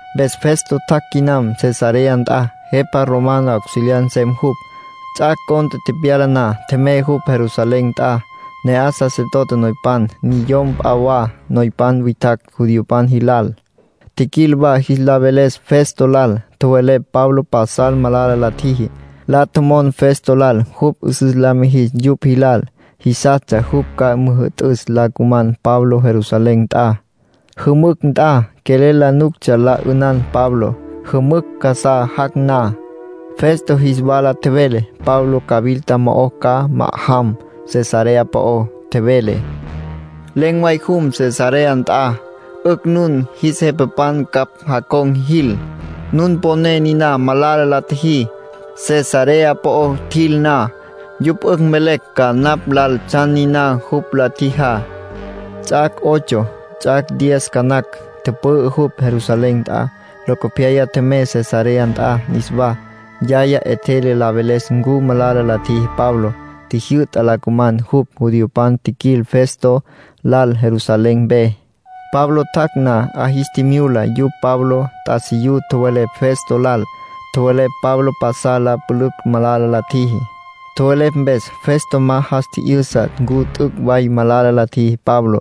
Mpes Festo tjac' quinam Cesarea nt'a, jepa romano auxiliar nsem jupj. Ts'ac' cont'e tepyala na, tjemey jupj Jerusalén nt'a. Ne'aj sacerdote noypan, niyom p'a wa noypan witjacj judiopan jilal, tjiquil wa jis la veles Festo lal. Tjowelepj Pablo pasal malala la tjiji. La tjomon Festo lal jupj 'üsüs la mijis yupj jilal. Jisastsja jupj ca müjü'tüs la cuman Pablo Jerusalén nt'a. Jümücj nt'a quelel la nuctsja la 'ünan Pablo, jümücj casá jac' na. Festo jis wala tjevele Pablo cawilta mo'o ca ma'ajam Cesarea po'ó. Tjevele: “Len̈ way jum Cesarea nt'a. 'Ücj nun jis jepapan ncapj jacon̈ jil. Nun poné niná malala la tjiji. Cesarea po'o tjil na, yupj 'ücj mvelecj ca napj lal tsjan niná jupj la tjijá”, nin tjevele. Ts'ac' ocho, ts'ac' diez ca nacj, tüpü'ü jupj Jerusalén nt'a. Locopyaya tjemey Cesarea nt'a niswá. Yaya 'etjele la veles ncu malala la tjiji Pablo. Tjijyü'ta la cuman jupj. Judiopan tjiquil Festo lal Jerusalén mpe. Pablo tjac' na, 'a jis tjimyula yupj Pablo t'asiyú. Tjowelepj Festo lal. Tjowelepj Pablo pasal la pülücj malala la tjiji. Tjowelepj mpes Festo ma jas tji'yüsa ncu t'üc' way malala la tjiji Pabló.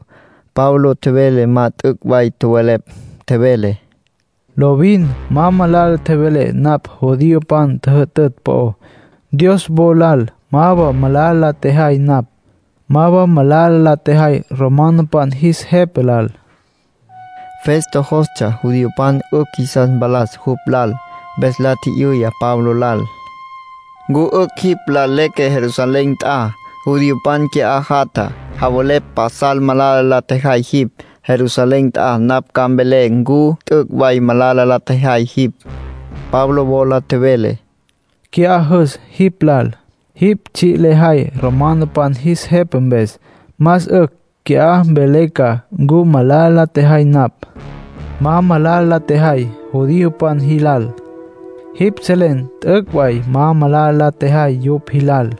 Pablo tjevele ma t'üc' way tjowelepj. Tjevele: —Lovin ma malala tjevelé napj judiopan tjüjütütj po'ó. Dios wo lal ma wa malala la tjejay napj. Ma wa malala la tjejay romanopan jis jepa lal —Pablo nin tjevele. Festo jostsja judiopan 'ücj jisas mpalas jupj lal. Mpes la tji'yüya Pablo lal: —¿Ncu 'ücj jipj lal leque Jerusalén nt'a? Judiopan qui'á jatja, javelepj pasal malala la tjejay jipj. Jerusalén nt'a napj ca mvelé ncu t'üc' way malala la tjejay jipj —Festo nin tjevele. Pablo wola tjevele: —Qui'á jüs jipj lal. Jipj tsji' lejay romanopan jis jepa mpes. Más 'ücj qui'á mvelen ca ncu malala la tjejay napj. Ma malala la tjejay judiopan jilal. Jipj selen t'üc' way ma malala la tjejay yupj jilal.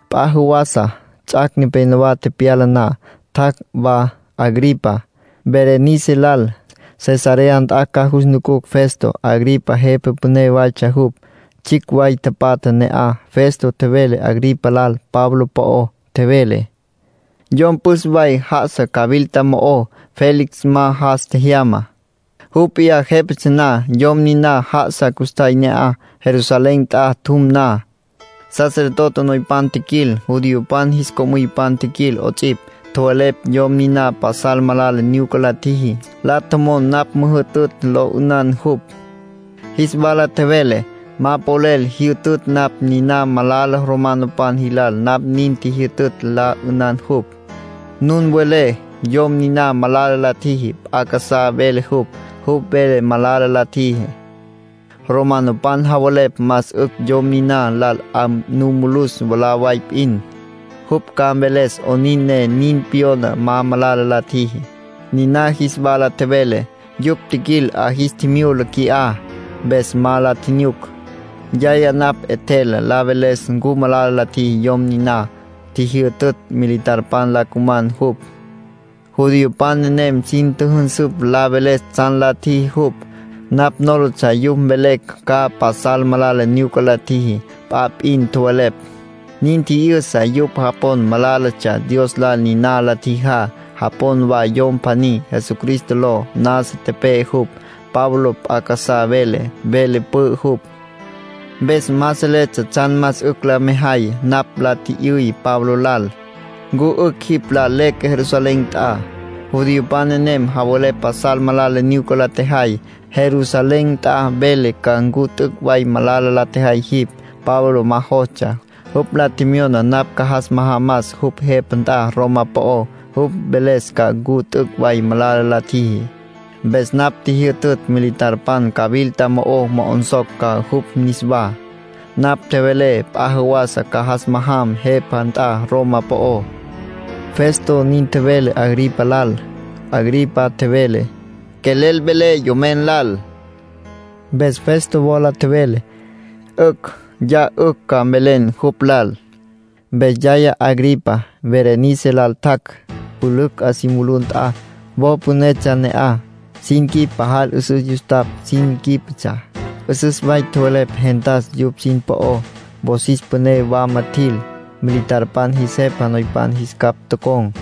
P'a jawasa, ts'ac' nepénowa tepyala na, tjac' wa Agripa, Berenice lal, Cesarea nt'a ca jus nucus Festo. Agripa jepa püné waytsja jupj. Tsjicj way tapatja ne'aj. Festo tjevele Agripa lal Pablo po'ó. Tjevele: —Yom püs way já'asa cawilta mo'ó. Félix ma jas tjejyama, jupj p'iyá jépatsja na. Yom niná já'asa custjay ne'aj. Jerusalén nt'a tjum na, sacerdote noypan tjiquil, judiopan jis co'müypan tjiquil 'ots'ipj, tjowelepj yom niná pasal malala nyuca la tjiji. La tjomon napj müjütütj lo 'ünan jupj. Jis wala tjevelé: ‘Ma polel jyütütj napj niná. Malala romanopan jilal napj nin jyütütj la 'ünan jupj. Nun welé yom niná malala la tjiji. P'a casá vele jupj. Jupj vele ma malala la tjiji. Romanopan javelepj más 'ücj yom niná lal 'a nu mulus mwalá way p'in. Jupj ca mveles 'onin ne nin pyona ma malala la tjiji’, niná jis wala tjevelé. ”Yupj tjiquil 'a jis tjimyula qui'á. Mpes ma la tjinyuc. Yaya napj 'etjel la veles ncu malala la tjiji yom niná. Tjijyütütj militarpan la cuman jupj. Judiopan nenem sin tjüjünsüpj la veles tsjan la tjiji jupj. Napj nólatsja yupj mvelecj ca pasal malala nyuca la tjiji. P'a p'in tjowelepj. Nin tji'yüsa yupj japon malálatsja Dios lal niná la tjijá. Japon wa yom pjaní, Jesucristo ló, nasa tepe'e jupj. Pablo p'a casá vele. Vele pü'ü jupj. Mpes ma seletsja tsjan más 'ücj la mejay. Napj la tji'yüy Pablo lal: ‘¿Ncu 'ücj jipj lal leque Jerusalén nt'a? Judiopan nenem javelepj pasal malala nyuca la tjejay. Jerusalén nt'a mvelé ca ncu t'üc' way malala la tjejay jipj’. Pablo ma jostsja. Jupj la tjemyona napj ca jas majamas jupj jepa nt'a Roma po'ó, jupj mveles ca ncu t'üc' way malala la tjiji. Mpes napj tjijyütütj militarpan cawilta mo'o mo'onsocj ca jupj niswá. Napj tjevelé p'a jawasa ca jas majam jepa nt'a Roma po'ó —Festo nin tjevele Agripa lal. Agripa tjevele: —Quelel velé yomen lal. Mpes Festo wola tjevele: —'Ücj. Ya 'ücj ca mvelen jupj lal. Mpes yaya Agripa, Berenice lal, tjac' pülücj 'a si mulú nt'a, wo pünetsja ne'aj. Sin quip pajal 'üsüs yustapj sin quípetsja. 'Üsüs way tjowelepj gentas yupj sin po'ó. Wosis püné wama tjil. Militarpan jis jepa noypan jis capj tocon̈,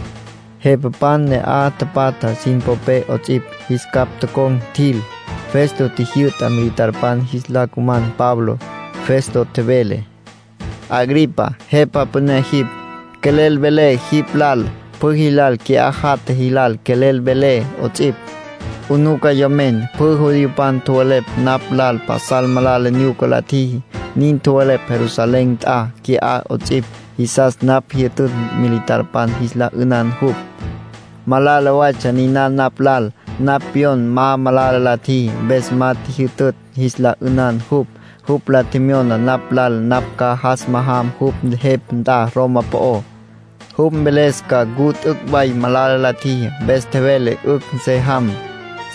jepapan ne'aj tapatja sin popé 'ots'ipj, jis capj tocon̈ tjil. Festo tjijyü'ta militarpan jis la cuman Pabló. Festo tjevele: —Agripa, jepa püné jipj, quelel velé jipj lal, pjü jilal qui'á jatja jilal quelel velé 'ots'ipj. 'Unuca yomen. Pjü judiopan tjowelepj napj lal pasal malala nyuca la tjiji. Nin tjowelepj Jerusalén nt'a, qui'á 'ots'ipj. Jisas napj jyütütj militarpan jis la 'ünan jupj. Malala waytsja niná napj lal. Napj pyon ma malala la tjiji. Mpes ma tjijyütütj jis la 'ünan jupj. Jupj la tjemyona napj lal napj ca jas majam jupj jepa nt'a Roma po'ó, jupj mveles ca ncu t'üc' way malala la tjiji. Mpes tjevelé 'ücj se jam.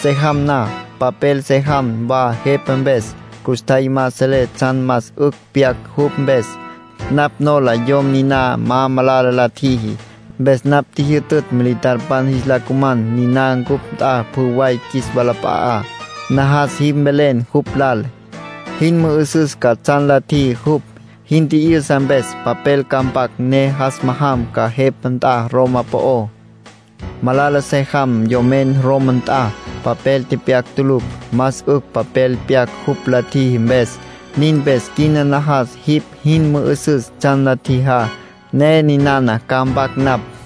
Se jam na, papel se jam wa jepa mpes. Custjay ma selé tsjan más 'ücj pyac jupj mpes; napj nola yom niná ma malala la tjiji. Mpes napj tjijyütütj militarpan jis la cuman niná cupj nt'a pjü way qjuis walap'a'á. Najas jipj mvelen jupj lal, jin mü'üsüs ca tsjan la tjiji jupj. Jin tji'yüsa mpes, papel ca mpac ne jas majam ca jepa nt'a Roma po'ó. Malala se jam yomen Roma nt'a, papel tepyac tulucj. Más 'ücj papel pyac jupj la tjiji mpes. Nin mpes quina najas jipj jin mü'üsüs tsjan la tjijá, ne ninana ca mpac napj.